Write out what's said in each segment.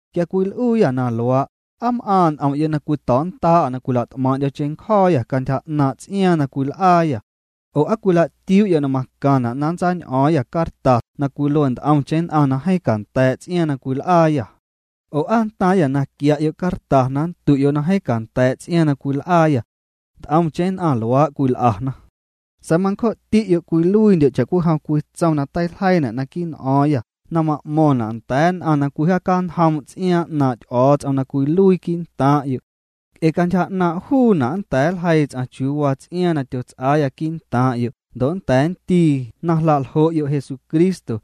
Quia cwil'uuyâ na luaa', ¿aa m'aaⁿ' n'om'yo' na cwito̱o̱'nnda'â na cwila't'maaⁿ'ndyo̱ cheⁿncjo̱o̱yâ cantyja 'naaⁿ' ts'iaaⁿ na cwil'aayâ? Oo ¿aa cwila'tiuu'yo' na macaⁿna' na nntsañ'o̱o̱ⁿyâ cartas na cwilue nt'omcheⁿ nn'aⁿ na jeeⁿ canda̱a̱' ts'iaaⁿ na cwil'aayâ? Oo ¿aa nntaaⁿyâ na quia'yo' carta na nndu'yo' na jeeⁿ canda̱a̱' ts'iaaⁿ cwil'aayâ? Nt'omcheⁿ nn'aⁿ luaa' cwil'ana. Sa̱a̱ mancjo'ti'yo' cwiluiindyo' cha'cwijom cwii tsom na teiljeiina' naquii' n'o̱o̱ⁿyâ na ma'mo̱ⁿna' nda̱a̱ nn'aⁿ na cwijaacañjoom' ts'iaaⁿ 'naaⁿ' Ty'o̱o̱ts'om na cwiluii quii'ntaaⁿ'yo'. Nc'e cantyja 'naaⁿ' juuna' nnda̱a̱ nljeii ts'aⁿ chiuu waa ts'iaaⁿ na tyots'aa quii'ntaaⁿ'yo' ndo' nnda̱a̱ nndii na jla'ljo'yo' Jesucristo.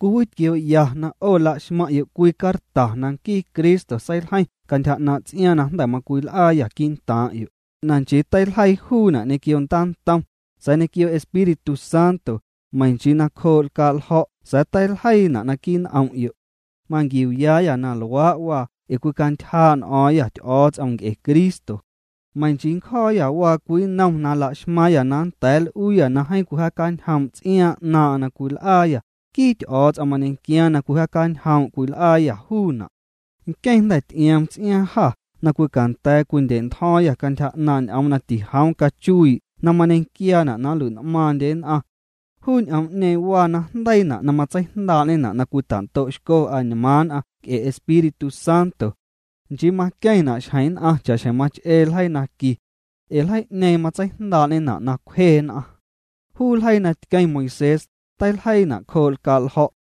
Cwiwitquioo'ya na 'o laxmaⁿ'yo' cwii carta na nquii Cristo seiljeiⁿ cantyja 'naaⁿ' ts'iaaⁿ na jnda̱ macwil'aayâ quii'ntaaⁿ'yo', na nchii teiljeii juuna' ñequio ndaantom, sa̱a̱ ñequio Espíritu Santo, meiⁿ nchii nacjoo' lcaa'ljo̱' sa̱a̱ teiljeiina' naquii' n'om'yo'. Manquiuuyaayâ na luaa' waa ee cwicantyjaa' n'o̱o̱ⁿyâ Ty'o̱o̱ts'om nc'e Cristo. Meiⁿ nchii ncjo̱o̱yâ waa cwii nnom na laxmaaⁿyâ na nda̱a̱ nl'uuyâ na jeeⁿ cwijaacañjoom' ts'iaaⁿ 'naaⁿ'aⁿ na cwil'aayâ, nquii Ty'o̱o̱ts'om mañequiaaⁿ na cwijaacañjoom' cwil'aayâ juuna'. Nqueⁿ jnda̱ ty'ioom ts'iaaⁿ jâ na cwicanda̱a̱ cwindya̱'ntjo̱o̱ⁿyâ cantyja 'naaⁿ' ñ'oom na tijoom cachuii' na mañequiaana' na nlui'n'maaⁿndye nn'aⁿ. Juu ñ'oom'ñeeⁿ waa najndeiina' na matseijndaa'ñena' na cwita'ndo'xco añmaaⁿ nn'aⁿ nc'e Espíritu Santo. Nchii maqueⁿna' xjeⁿ nn'aⁿ cha'xjeⁿ mach'ee ljeii naqui. Ee ljeii'ñeeⁿ matseijndaa'ñena' na cwje nn'aⁿ. Juu ljeii na tqueⁿ Moisés, teiljeiina' cjoo' lcaa' ljo̱'.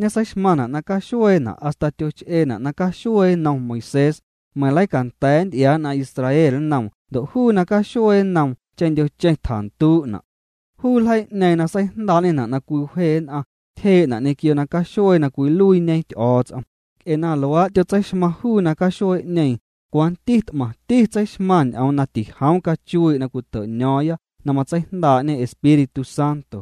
Ñeseixmaⁿna' na caxueena' hasta tyoch'eena' na caxuee nnom Moisés, meiⁿ leicanda̱a̱ nty'iaa nn'aⁿ Israel nnoom ndo' juu na caxuee nnoom cheⁿndyocheⁿ tjanduu'na'. Juu ljeii'ñeeⁿ na seijndaa'ñena' na cwiwje nn'aⁿ, tyjee'na' ñequio na caxuee na cwiluiiñe Ty'o̱o̱ts'om, nc'e na luaa' tyotseixmaⁿ juu na caxuee'ñeeⁿ, cwanti t'maⁿti tseixmaⁿ ñ'oom na tijoom cachuii' na cwito'ño̱o̱ⁿya na matseijndaa'ñe Espíritu Santo.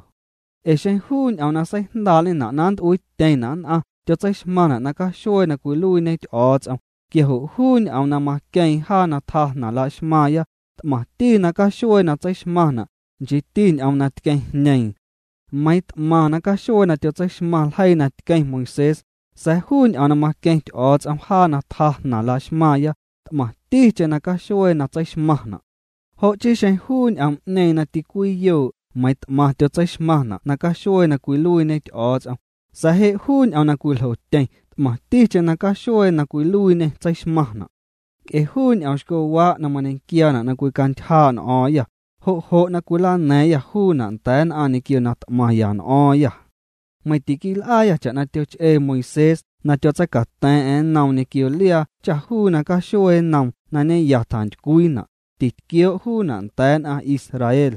Ee xeⁿ juu ñ'oom na seijndaa'ñena' na nnt'uiityeⁿna' nn'aⁿ tyotseixmaⁿna' na caxuee na cwiluiiñe Ty'o̱o̱ts'om, quia jo' juu ñ'oom na maqueeⁿ jaa na tjaa jnaⁿ jlaxmaaⁿya, t'maⁿti na caxuee na tseixmaⁿna', nchiiti ñ'oom na tqueeⁿjñeeⁿ. Meiiⁿ t'maⁿ na caxuee tyotseixmaⁿ ljeii na tqueⁿ Moisés, sa̱a̱ juu ñ'oom na maqueⁿ Ty'o̱o̱ts'om jaa na tjaa jnaⁿ laxmaaⁿya, t'maⁿticheⁿ nacaxuee na tseixmaⁿna'. Jo' chii xeⁿ juu ñ'oom'ñeeⁿ na ticwiyoo' meiiⁿ t'maⁿ tyotseixmaⁿna' na caxuee na cwiluiiñe Ty'o̱o̱ts'om, sa̱a̱ je' juu ñ'oom na cwiljotyeⁿ t'maⁿticheⁿ na caxuee na cwiluiiñê tseixmaⁿna'. Nc'e juu ñ'oomxcowaa' mañequiaana' na cwicantyjaa' n'o̱o̱ⁿyâ, jo' jo' na cwilana̱a̱ⁿyâ juuna' nda̱a̱ nn'aⁿ ñequio na t'maⁿya n'o̱o̱ⁿyâ. Meiⁿ tiquil'aayâ cha'na tyoch'ee Moisés na tyotseicata̱a̱ⁿ'a̱ⁿ nnoom ñequio liaa cha juu na caxuee nnoom na ñeya tjantycwiina', titquioo' juuna' nda̱a̱ nn'aⁿ Israel.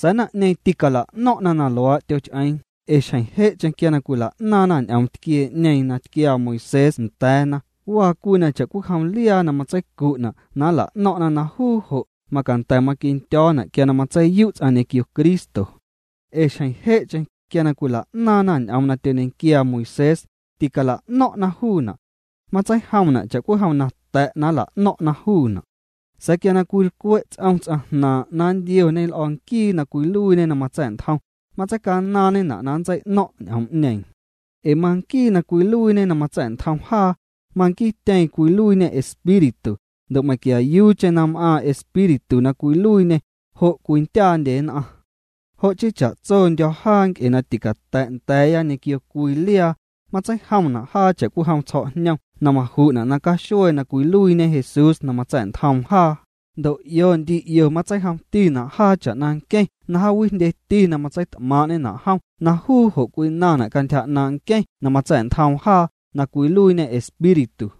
Sa̱a̱ naⁿ'ñeeⁿ tîcala'no̱ⁿ'na na luaa' tyoch'eeⁿ ee xjeⁿ je'cheⁿ quia cwila'naaⁿna ñ'oom tquiee'ñeeⁿ na tquiaa Moisés nda̱a̱na waa cwii na cha'cwijom liaa na matseicu'na' na nla'no̱ⁿ'na na juu jo' macanda̱ maquindyo̱na' quia na matseiyu' ts'aⁿ ñequio Cristo. Ee xjeⁿ je'cheⁿ, quia na cwila'naaⁿna ñ'oom na tyoñequiaa Moisés, ticala'no̱ⁿ'na juuna'. Matseijomna' cha'cwijom na ta̱' na nla'no̱ⁿ'na juuna'. Sa̱a̱ quia cwilcwe' ts'om ts'aⁿ jnaaⁿ' na nntioñe l'o̱ nquii na cwiluiiñe na matsa̱'ntjom, matseicanaaⁿñena' na nntsei'no̱ⁿ' ñ'oom'ñeeⁿ. Ee manquii na cwiluiiñe na matsa̱'ntjom jaa, manquiityeeⁿ cwiluiiñê Espíritu, ndo' meiⁿquiayuucheⁿ na m'aaⁿ Espíritu na cwiluiiñê, jo' cwindyaandye nn'aⁿ. Jo' chii cha'tsondyo̱ jaa nc'e na ticata̱' nda̱a̱ya ñequio cwii liaa, matseijomna' jaa cha'cwijom tsjo̱'jnom na maju'na' na caxuee na cwiluiiñe Jesús na matsa̱'ntjoom jaa, ndo' 'io ndi 'io matseijomtina' jaa cha'na nqueⁿ na jaawijndyeti matseit'maaⁿ'ñena' jom na juu jo' cwinaⁿna' cantyja 'naaⁿ' nqueⁿ na matsa̱'ntjoom jaa, na cwiluiiñê Espíritu.